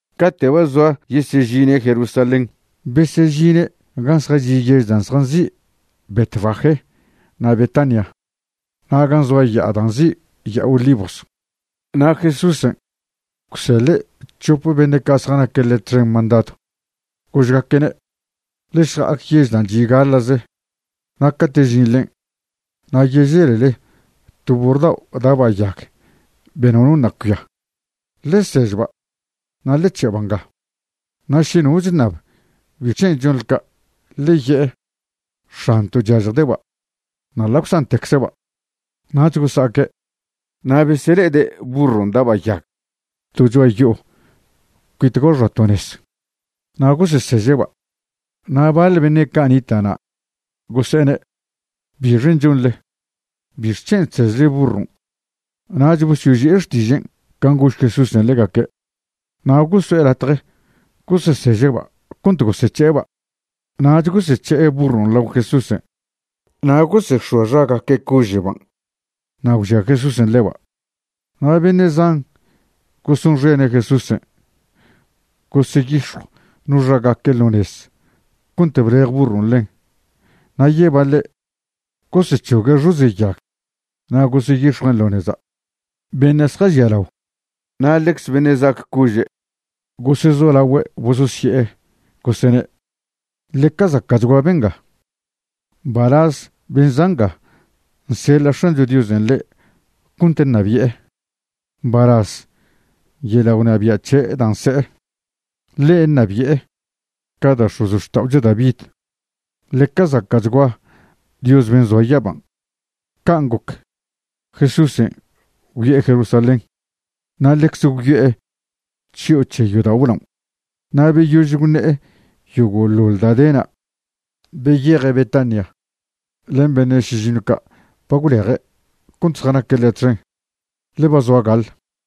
Cate' ba zoa yesežine' Jerusalén, besežine' gan' zjachi' yež dan' zjanzi' Betfagé na' Betania na' gan' zoa ya'a da' nzi' Ya'a Olivos. Na' Jesúsen' gwseḻe' c̱hop beṉe' ca' zjanaque' ḻe' txen mandadw, gožgaque'ne': ―Ḻe šja'ac yež dan' chi' gaḻa'ze, na' cate' žinḻen' na' yeželele to burr dao' da'ba' yag be nono ṉa' cuia. Ḻe sežba' na' ḻe c̱he'ba' nga. Na' še no chṉab bic̱hen' chonḻe ca', ḻe ye'e: “X̱anto' chyažjde'ba'”, na' ḻa' gwzantecze'ba'. Nach gosa'aque', na' besele'ede' burron' da'ba' yag to cho'a yo'o cuit ga xoa to nez, na' goseseže'ba'. Na' baḻ beṉe' ca' nita' na' gose'ene': ―¿Bixen' chonḻe? ¿Bixc̱hen' chsežle burron'? Nach bosyoži'e xtižen' can' gož Jesúsen' ḻegaque', na' goso'e latje goseseže'ba' cont gosec̱he'eba'. Nach gosec̱he'e burron' lao Jesúsen' na' gosex̱oa xagaque' cože'ban' na' gwžia Jesúsen' ḻeba'. Na' beṉe' zan gosonxene' Jesúsen' goseyix̱jw no xagaque' ḻo nez cont blej burron' ḻen na' yebaḻe' gosec̱hogue' xoze' yag na' goseyix̱juen' ḻo neza'. Beṉe' zjažialao na' ḻecze beṉe' za'ac cože' gosezolagüe' bososye'e, gosene': ―¡Ḻeca zaca'chgua benga! ¡Mbalaz ben' za' nga nseḻa' X̱ancho Diosen' ḻe' cont ṉabi'e! ¡Mbalaz yeḻa' gwnabia' c̱he' da' nse'e, ḻe' ṉabi'e ca da' x̱ozxta'ocho David! ¡Ḻeca zaca'chgua Dios ben' zoa yaban'! Can' goc, Jesúsen' gwyo'e Jerusalén, na' ḻecze gwyo'e chyo'o c̱he yodao' blaon'. Na' beyož gwṉe'e yogo'ḻoḻ da' de na', beyeje' Betania len beṉe' šižiṉw ca' ba gwleje' cont zjanaque' ḻe' txen, ḻe ba zoa gaḻ.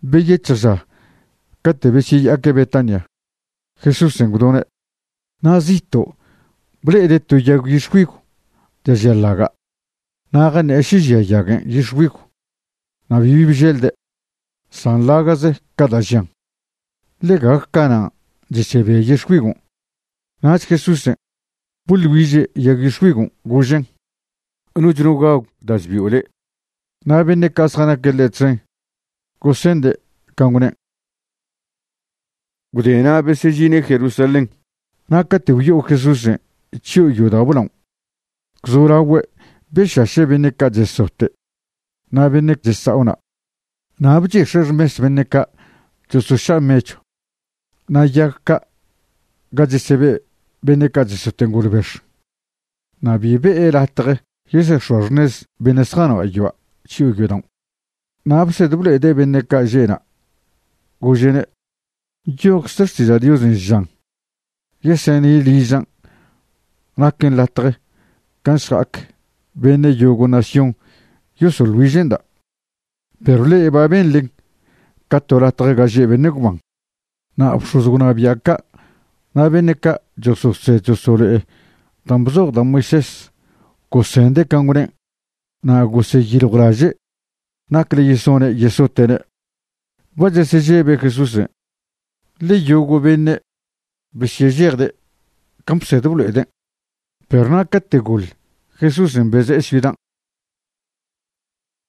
Beyec̱hj ža cate' besyeya'aque' Betania, Jesúsen' gwdone'. Na' zito' ble'ede' to yag yix̱güigw da' žia ḻaga', na' jaṉe'e še žia yaguen' yix̱güigw, na' bibi bželde', san ḻaga'ze ca' da' žian, ḻe gague canan' chesebia yix̱güigon'. Nach Jesúsen' boḻ güiže' yag yix̱güigon', gožen': ―Noch no gagw da' chbio' le'. Na' beṉe' ca' zjanaque' ḻe' txen gosende' can' gwnen'. Gwdena' besežine' Jerusalén. Na' cate' gwyo'o Jesúsen' chyo'o yodao' blaon', gwzolagüe' bešaše' beṉe' ca' chesote' na' beṉe' chesa'o na'. Na' bchix̱e' xmes beṉe' ca' chosoša' mechw na' yag ga chesebe' beṉe' ca' chesote' ngolbex. Na' bi be'e latje yesex̱oa xṉez beṉe' zjanoa' yoa' chyo'o yodaon'. Na' bsed blo'ede' beṉe' ca' že' na', gože'ne': ―Nyojcze Xtiža' Diosen' žan: “Yesene' ližan' naquen latje gan' šja'ac beṉe' yogo' nación yosoḻ güiže'nda'”, perw le'e ba benḻen ca to latje ga že' beṉe' gwban. Na' bx̱oz gwnabia' ca' na' beṉe' ca' chososed chosolo'e dan' bzoj da' Moisés gosende' can' gwnen', na' goseyiljwlaže' nacle yesone' yesote'ne'. Ba chesežebe' Jesúsen', ḻe yogo' beṉe' besyežejde' can' bsed blo'eden'. Perw na' cate' goḻ, Jesúsen beze'e ciudan'.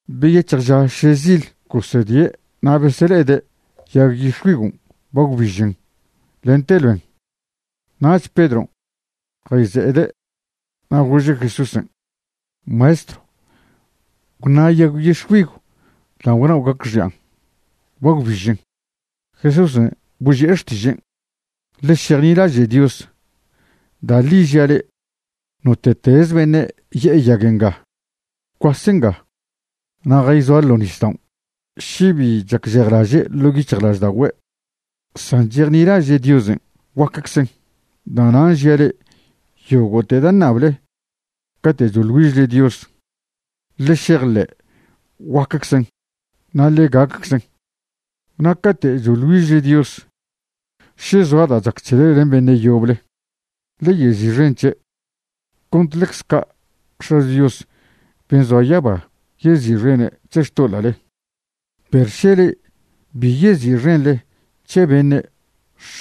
Beyec̱hj ža šezil, gosedie' na' besele'ede' yag yix̱güigon' ba gwbižen lente loen. Nach Pedron' jayze'ede' na' gože' Jesúsen': ―Maestro, gwṉa' yag yix̱güigw dan' gwnao' gacxi'an, ba gwbižen. Jesúsen' boži'e xtižen': ―Ḻe šejnilaže' Dios. Da' ḻi žia' le'e, note'teze beṉe' ye'e ya'a nga: “Gwcuase nga na' jayzoa ḻo' nisdao'”, še bi chacžejlaže' ḻo' yic̱hjlažda'ogüe', san chejnilaže' Diosen', guacczen. Da'nan' žia' le'e, yogo'te da' ṉable cate' choḻ güižle Dios, ḻe šejḻe' guaqueczen, na' ḻe gacczen. Na' cate' choḻ güižle Dios, še zoa da' chac c̱hele len beṉe' yoble, ḻe yezi'xen c̱he', cont ḻecze ca' X̱acho Dios ben' zoa yaba yezi'xene' c̱he xtoḻa'le. Perw še le'e bi yezi'xenḻe c̱he beṉe',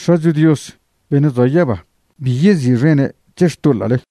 X̱acho Dios beṉe' zoa yaba bi yezi'xene' c̱he xtoḻa'le.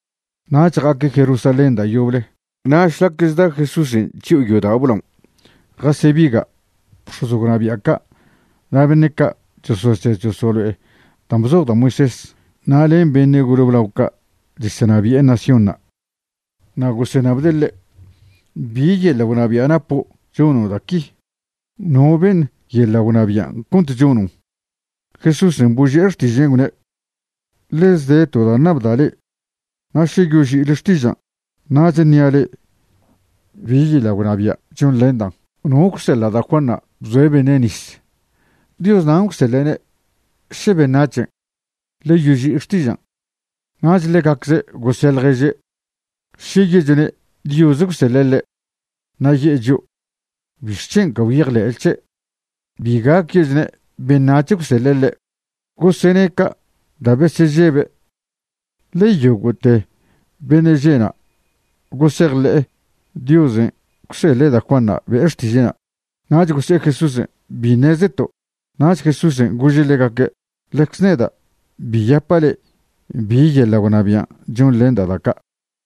Nach ja'aque' Jerusalén da' yoble, na' šlac chda Jesúsen' chyo'o yodao' blaon' jasebiga' bx̱oz gwnabia' ca' na' beṉe' ca' chososed chosolo'e dan' bzoj da' Moisés na' len beṉe' gole blao' ca' chesenabi'e naciónṉa'. Na' goseṉabde' ḻe': ―¿Bi yeḻa' gwnabia' napo' chono' da' qui? ¿No beṉ yeḻa' gwnabian' cont chonon'? Jesúsen' boži'e xtižen', gwne': ―Ḻeze de to da' ṉabda' le'e na' še yoži'ile xtižan', nach ṉia' le'e bi yeḻa' gwnabia' chonḻendan'. ¿No gwseḻa' da' Juanṉa' bzoe' beṉe' nis? ¿Dios nan' gwseḻe'ne' še beṉac̱hen'? Ḻe yoži'i xtižan'. Nach ḻegacze' gose' ḻježe': ―Še ye'chone' Dios gwseḻe' ḻe', na' ye'e chio': “¿Bixc̱hen' ca gwyejḻe'le c̱he'?” Bi gac ye'chone' beṉac̱h gwseḻa' ḻe'. Gosene' ca' da' besežebe', ḻe yogo'te beṉe' že' na' gosejḻe'e Diosen' gwseḻe' da' Juanṉa' be'e xtiže'na'. Nach gose'e Jesúsen': ―Bi ṉezeto'. Nach Jesúsen' gože' ḻegaque': ―Ḻecze neda' bi yapa' le'e bi yeḻa' gwnabian' chonḻenda' da' ca'.